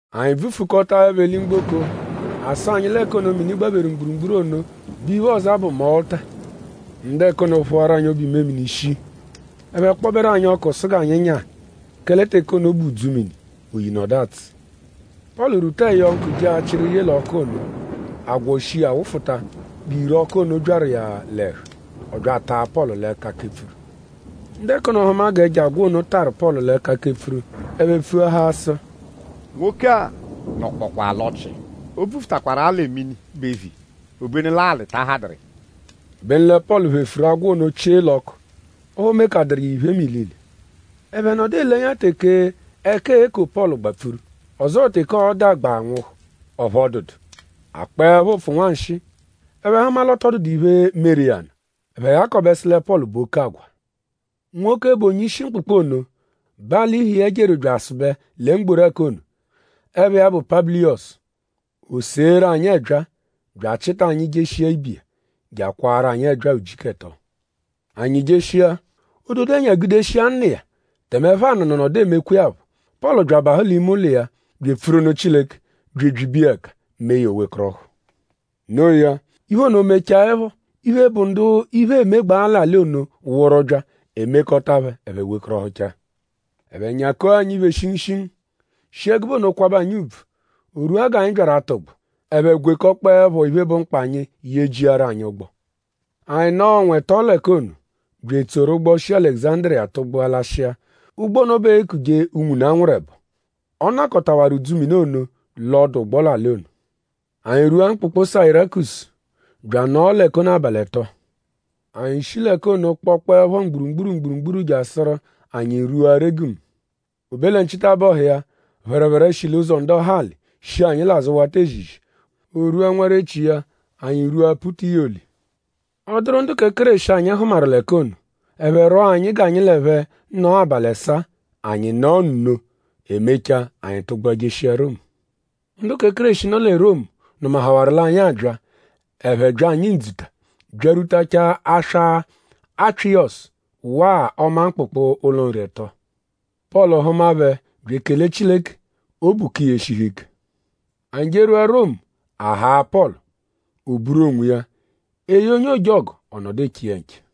Anyi bvufukọtaepho eli-mgboko; a sụ anyi l'ẹka ono, mini gbapheru mgburugburu ono bu iphe, ọoza bụ Mọluta. Ndu ẹka ono phụaru anyi obu-imemini shii. Ẹphe kpọberu anyi ọku sụ g'anyi nyaa; kẹle teke ono bụ udzumini; oyi nọdu atsụ. Pọlu rwuta ẹyonku je achịru yee l'ọku ono. Agwọ shi iya wụfuta g'ìrè ọku ono byaru iya l'ẹhu. Ọ bya ataa Pọlu l'ẹka kepfuru. Ndu ẹka ono hụma g'ẹjo agwọ ono tarụ Pọlu l'ẹka kepfuru; ẹphe pfuahaa sụ: “Nwoke-a nọkpokwaa l'ọ́chì. O bvufutaakwaru-a lẹ mini bu eviya; obenu l'alị ta ahadụru iya.” Obenu lẹ Pọlu phefuru agwọ ono chie l'ọku; ọphu o mekadụru iya iphe mẹ ilile. Ẹphe nọdu ele ẹnya teke ẹka e-ko Pọlu gbapfuru; ọzoo teke ọo-da gba nwụhu; ọphu ọ dụdu. A kpọepho ụpfu nwanshịi; ẹphe hụma l'ọ tọ dụdu iphe, meru iya nụ; ẹphe ghakọbe sụ lẹ Pọlu bụ oke agwa. Nwoke, bụ onye-ishi mkpụkpu ono bẹ alị-ihe iya jeru bya asụbe lẹ mgboru ẹka ono. Ẹpha iya bụ Pabuliyọsu. O seeru anyi ẹbyaa; bya achịta anyi jeshia ibe iya; je akwaaru anyi ẹbyaa ujiku ẹto. Anyi jeshia; ododo-ẹnya gudeshiwaa nna iya; tẹme ẹpho-anụ̀nù nọdu emekwa iya phọ. Pọlu bya abahụ l'ime ụlo iya bya epfuru nụ Chileke bya ebyibe iya ẹka; mee ya o wekọrohu. Noo ya; iphe ono mechaẹpho; iphe, bụ ndu iphe emegbaa l'alị ono wụru bya; e mekọta phẹ ẹphe wekọrohuchaa. Ẹphe nyako anyi iphe shingushingu; shi ẹgube ono kwabẹ anyi ùbvù. O rwua g'anyi byaru atụgbu; ẹphe gwekọkpoepho iphe, bụ mkpa anyi yejiaru anyi ụgbo. Anyi nọo ọnwa ẹto l'ẹka ono, bya etsoru ụgbo, shi Alẹguzandiriya tụgbua lashịa. Ụgbo ono bẹ eekuje “Unwune, a nwụru ẹbo.” Ọ nọkotawaru udzumini ono l'ọdu-ụgbo l'alị ono. Anyi rwua mkpụkpu Sayirakusu bya anọo l'ẹka ono abalị ẹto. Anyi shi l'ẹka ono kpọkpoepho mgburugburu mgburugburu jasụru anyi rwua Regumu. O be lẹ nchitabọhu iya; phẹrephere shi l'ụzo ndọhali shi anyi l'azụ wata ezizi. O rwua nwarechi iya; anyi rwua Putiyoli. Ọ dụru ndu kẹ Kéreshi, anyi hụmaru l'ẹka ono. Ẹphe rwọo anyi g'anyi l'ẹphe nọo abalị ẹsaa; anyi nọo nno. E mechaa; anyi tụgbua jeshia Romu. Ndu kẹ Kéreshi, nọ lẹ Romu nụmahawaru l'anyi abya; ẹphe bya anyi ndzuta byarwutachaa aswa Apyịyosu waa ọma mkpụkpu, “Ụlo nri ẹto.” Pọlu hụma phẹ bya ekele Chileke; obu ka iya eshihu ike. Anyi jerwua Romu; a haa Pọlu; o buru l'onwiya. E ye onye ojọgu; ọ nọdu eche iya nche.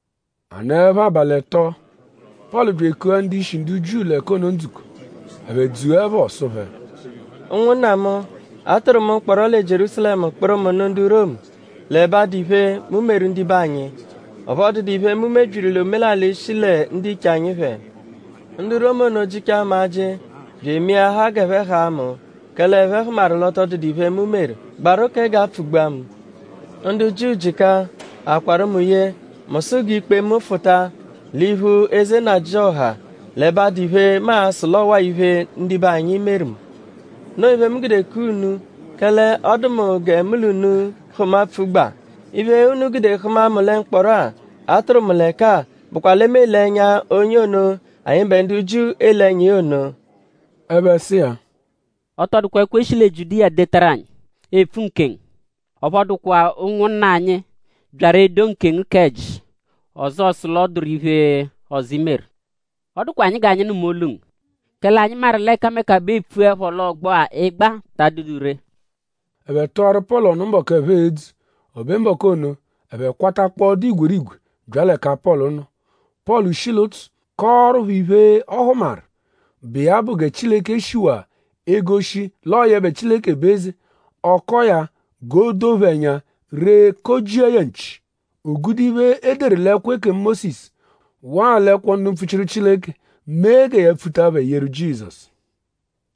A nọepho abalị ẹto; Pọlu bya ekua ndu-ishi ndu Jiu l'ẹka ono ndzukọ. Ẹphe dzuẹpho; ọ sụ phẹ: “Ụnwunna mu; a tụru mu mkpọro lẹ Jierúsalẹmu kpụru mu nụ ndu Romu l'ẹbe adụ iphe, mu meru ndibe anyi; ọphu ọ dụdu iphe, mu mebyiru l'omelalị, shi lẹ ndiche anyi phẹ. Ndu Romu ono jịchaa mu ajị bya emeahaa g'ẹphe haa mu; kẹle ẹphe hụmaru l'ọ tọ dụdu iphe, mu meru, gbaru kẹ g'a pfụ-gbua mu. Ndu Jiu jịka. A kwarụ mu ye; mu sụ g'i kpe mu fụta l'iphu eze nnajịoha l'ẹbe adụ iphe, mu a-sụ l'ọwa-a iphe, ndibe anyi meru mu. Noo iphe, mu gude kua unu; kẹle ọ dụ mu gẹ mu l'unu hụma pfugba. Iphe, unu gude hụma mu lẹ mkpọro-a, a tụru mu l'ẹka-a bụkwa lẹ mu ele ẹnya onye ono, anyịbe ndu Jiu ele ẹnya iya ono.” Ẹphe sụ iya: “Ọ tọ dụkwa ẹkwo, e shi lẹ Jiudiya detaru anyi, epfu nkengu. Ọphu ọ dụkwa ụnwunna anyi, byaru edo nkengu k'ẹji; ọzoo sụ l'ọ dụru iphe ọzo, i meru. Ọ dụkwa anyi g'anyi nụma olu ngu; kẹle anyi maru l'ẹkameka bẹ eepfuẹpho l'ọgbo-a, ị gbaa ta adụdu ree.” Ẹphe tụaru Pọlu ọnu mbọku, ẹphe e-dzu. O be mbọku ono; ẹphe kwatakpọo dụ igwerigwe bya l'ẹka Pọlu nọ. Pọlu shi l'ụtsu kọoru phẹ iphe, ọ hụmaru, bụ iya bụ gẹ Chileke shiwaa egoshi l'ọo yẹbe Chileke bụ eze; ọ kọo ya g'o doo phẹ ẹnya ree kọ-jia ya nchi. O gude iphe, e deru l'ẹkwo ekemu Mósisu waa l'ẹkwo ndu mpfuchiru Chileke mee gẹ ya pfuta phẹ yeru Jizọsu.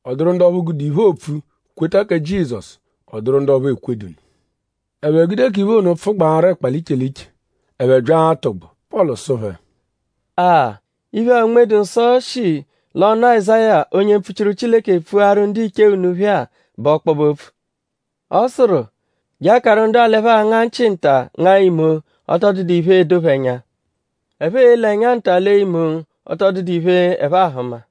Ọ dụru ndu ọphu gude iphe, oopfu kweta kẹ Jizọsu; ọ dụru ndu ọphu ekwedu nụ. Ẹphe gude k'iphe ono pfụgbaaru ẹkpa l'iche iche. Ẹphe bya atụgbu; Pọlu sụ phẹ: “A-a! Iphe-a, Unme-dụ-Nsọ shi l'ọnu Azáya; onye mpfuchiru Chileke pfuaru ndiche unu phẹ-a bụ ọkpobe-opfu. Ọ sụru: “Je akaru ndu-a l'ẹphe a-nga nchị nta ngaa imo; ọ tọ dụdu iphe, edo phẹ ẹnya. Ẹphe e-lee ẹnya nta lee imo; ọ tọ dụdu iphe, ẹphe ahụma.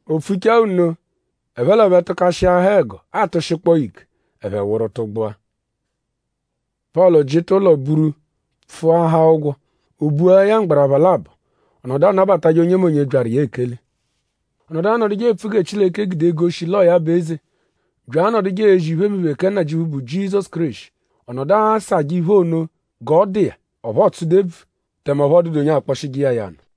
O pfuchaa nno; ẹphe l'ẹphe tụkashiahaa ẹgo atụshikpoo ya ike; ẹphe wụru tụgbua. Pọlu jịta ụlo buru pfụahaa ụgwo. O bua ya mgbarapha labọ. Ọ nọdu anabatajẹ onyemonye, byaru iya ekele. Ọ nọdu anọduje epfu gẹ Chileke gude egoshi l'ọo ya bụ eze bya anọduje ezi iphemiphe, kẹ Nnajịuphu, bụ Jizọsu Kéreshi. Ọ nọdu asajẹ iphe ono g'ọ dụ iya. Ọphu ọ tsụdu ebvu; tẹme ọphu ọ dụdu onye akpọshije iya ya nụ.